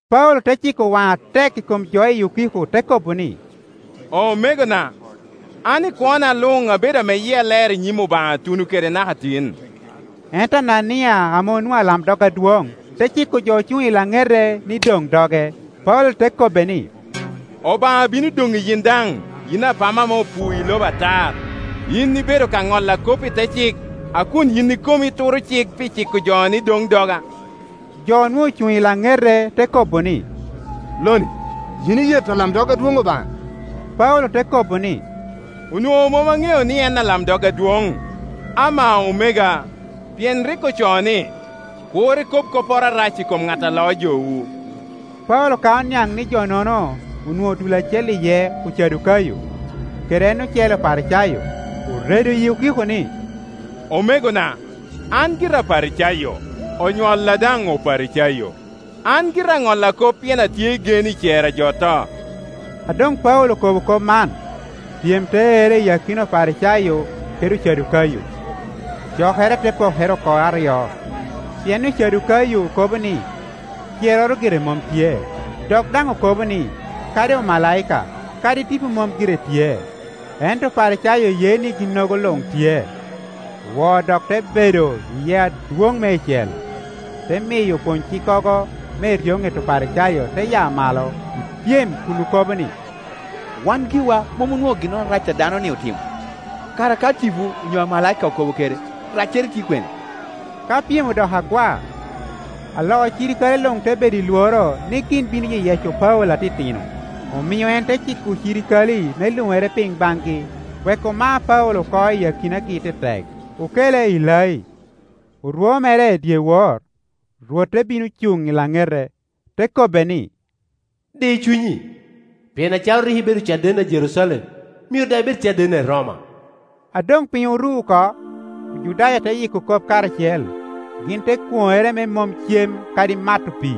Paulo te ciko waŋe atek i komjo i okiko, te kobo ni, “Omegona, an i kwona luŋ abedo ame yia ler i nyim Obaŋa tuno kede naka tin.” Ento Anania ame onwoŋo alamdog adwoŋ, te ciko jo ocuŋ i laŋete ni doŋ doge. Paulo te kobbe ni, “Obaŋa bino doŋi yin daŋ, yin apama ame opuo i lobo atar! Yin ibedo ka ŋolla kop i te cik, a kun yin ikomi ituro cik pi ciko ni doŋ doga?” Jo onwoŋo ocuŋ i laŋete te kobo ni, “Loni, yin iyeto alamdog adwoŋ Obaŋa?” Paulo te kobo ni, “Onwoŋo mom aŋeo ni en alamdog adwoŋ, amaa omega, pien rik ocoo ni, ‘Kur ikob kopporo arac i kom ŋat a loo jowu.’” Paulo ka oniaŋ ni jo-nono onwoŋo dul acel iye Ocadukayo, kede en ocele Oparicayo, oredo i okiko ni, “Omegona, an gira Aparicayo, onywalla daŋ Oparicayo. An gira aŋolla kop pien atye i gen i cer a jo oto.” A doŋ Paulo okobo kop man, pyem te erre i akina Oparicayo kede Ocadukayo, cokere te pokere oko aryo. Pien Ocadukayo kobo ni, cerroro gire mom tye, dok daŋ okobo ni, kadi omalaika, kadi tipo mom gire tye, ento Oparicayo ye ni ginnogo luŋ tye. Woo dok te bedo iye adwoŋ meicel, te miyo opwony-cikkogo me eryoŋet Oparicayo te ya malo i pyem kun okobo ni, “Wan giwa mom onwoŋo ginnoro arac a dano-ni otimo. Kara ka tipo onyo amalaika okobo kede, raccere tye kwene?” Ka pyem odoko agwa, alo cirikale luŋ te bedo i lworo ni gin bino yeyeco Paulo atitino, omio en te ciko ocirikale me luŋere piny baŋgi, wek oma Paulo oko iyi akinagi tetek, okele i lai. Orwo mere i dyewor, Rwot te bino cuŋ i laŋete, te kobbe ni, “Di cunyi, pien acalo rik ibedo cadenna i Jerucalem, myero daŋ ibed cadenna i Roma.” A doŋ piny oru oko, Ojudaya te yiko kop karacel. Gin te kwoŋere me mom cem kadi mato pii,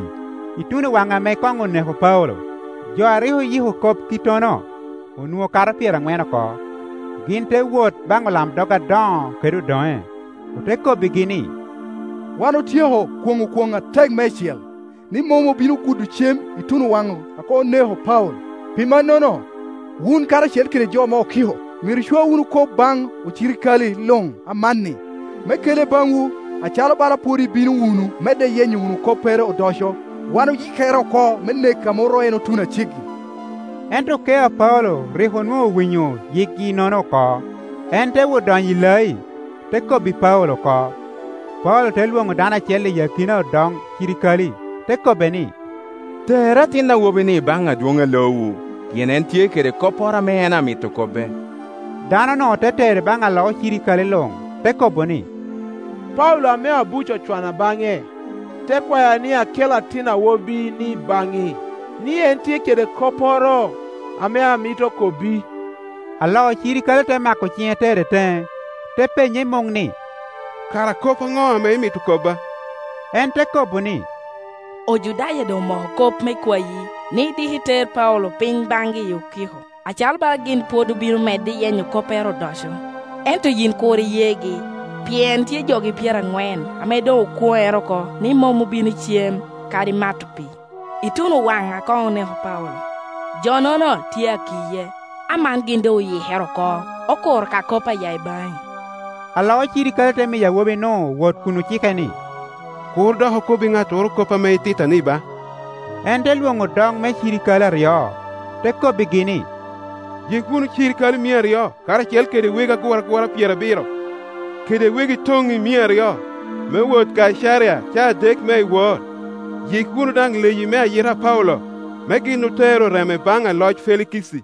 ŋuno waŋ ame koŋ oneko Paulo. Jo a rik oyiko kop kittono, onwoŋo kato pyeraŋwen oko. Gin te wot baŋ olamdog adoŋo kede odoŋe, ote kobbigi ni, “Wan otyeko kwoŋo kwoŋ atek meicel, ni mom obino gudo cem ituno waŋ a koŋ oneko Paulo. Pi mannono, wun karacel kede jo me okiko, myero icwa wunu kop baŋ alo ocirikale luŋ amanni, me kele baŋwu, acalo bala pwod ibino wunu medde yenyo wunu koppere odoco. Wan oyikere oko me neke a mom ru en otuno a ceggi.” Ento okeo a Paulo rik onwoŋo owinyo yikgi-nono oko; en te wot donyo i lai, te kobbi Paulo oko. Paulo te lwoŋo dano acel i akina odoŋ cirikale, te kobbe ni, “Ter atin awobi-ni baŋ adwoŋ a loowu, pien en tye kede kopporo ame en amito kobbe.” Dano-nu te tere baŋ alo ocirikale luŋ, te kobo ni, “Paulo ame abuc ocwana baŋe, te kwaya ni akel atin awobi-ni baŋi, ni en tye kede kopporo ame amito kobbi.” Alo cirikale te mako ciŋe tere teŋe, te penye i muŋ ni, “Kara kop aŋo ame imito kobba?” En te kobo ni, “Ojudaya doŋ omoko kop me kwayi ni diki ter Paulo piny baŋgi i okiko, acalo bala gin pwod obino medde iyenyo koppere odoco. Ento yin kur iyegi, pien tye jogi pyeraŋwen ame doŋ okwonere oko ni mom obino cem kadi mato pii, ituno waŋ a koŋ oneko Paulo, jo-nono tye a kiye. Aman gin doŋ oyikere oko, okuro ka kop a ya i baŋi.” Alo ocirikale te miyo awobi-nu wot kun ocike ni, “Kur dok okobbi ŋattoro kop ame ititta-ni ba.” En te lwoŋo odoŋ me cirikale aryo, te kobbigi ni, “Yik wunu cirikale mia aryo, karacel kede wegi aguragura pyerabiro, kede wegi toŋi mia aryo, me wot Kaicaria caa adek me iwor. Yik wunu daŋ leyi me ayita a Paulo, me gin otere oreme baŋ aloc Felikici.”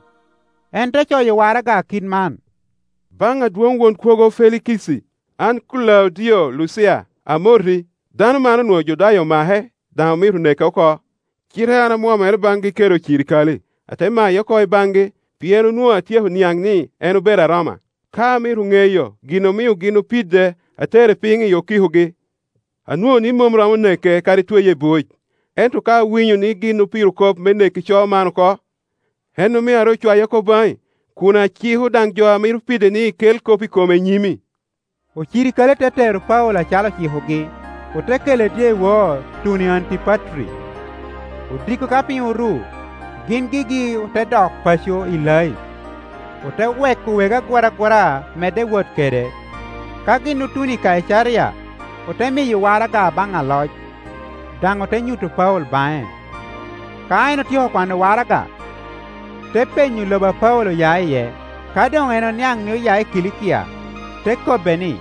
En te coyo waraga kit man, “Baŋ adwoŋ Won Kwogo aloc Felikici. An Kulaudio Lucia, amoti. Dano man onwoŋo Ojudaya omake, daŋ omito neke oko, cite an amwomere baŋgi kede ocirikale, ate maye oko i baŋgi, pien onwoŋo atyeko niaŋ ni en obedo Aroma. Ka amito ŋeyo gin omio gin opide, atere piny i okikogi. Anwoŋo ni mom romo neke kadi tweye i buc. Ento ka awinyo ni gin opiro kop me neko ico man oko, en omio aru cwaye oko baŋi, kun aciko daŋ jo a mito pide ni kel kop i kome i nyimi.” Ocirikale te tero Paulo acalo ocikogi, ote kele dyewor tuno i Antipatri. Odiko ka piny oru, gin gigi ote dok paco i lai, ote weko wegi aguragura medde wot kede. Ka gin otuno i Kaicaria, ote miyo waraga baŋ aloc, daŋ ote nyuto Paulo baŋe. Ka en otyeko kwano waraga, te penyo lobo a Paulo oya iye. Ka doŋ en oniaŋ ni oya i Kilikia, te kobbe ni,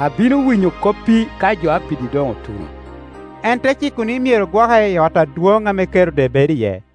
“Abino winyo koppi ka jo a pidi doŋ otuno.” En te ciko ni myero gwoke i ot adwoŋ ame Kerode bedo iye.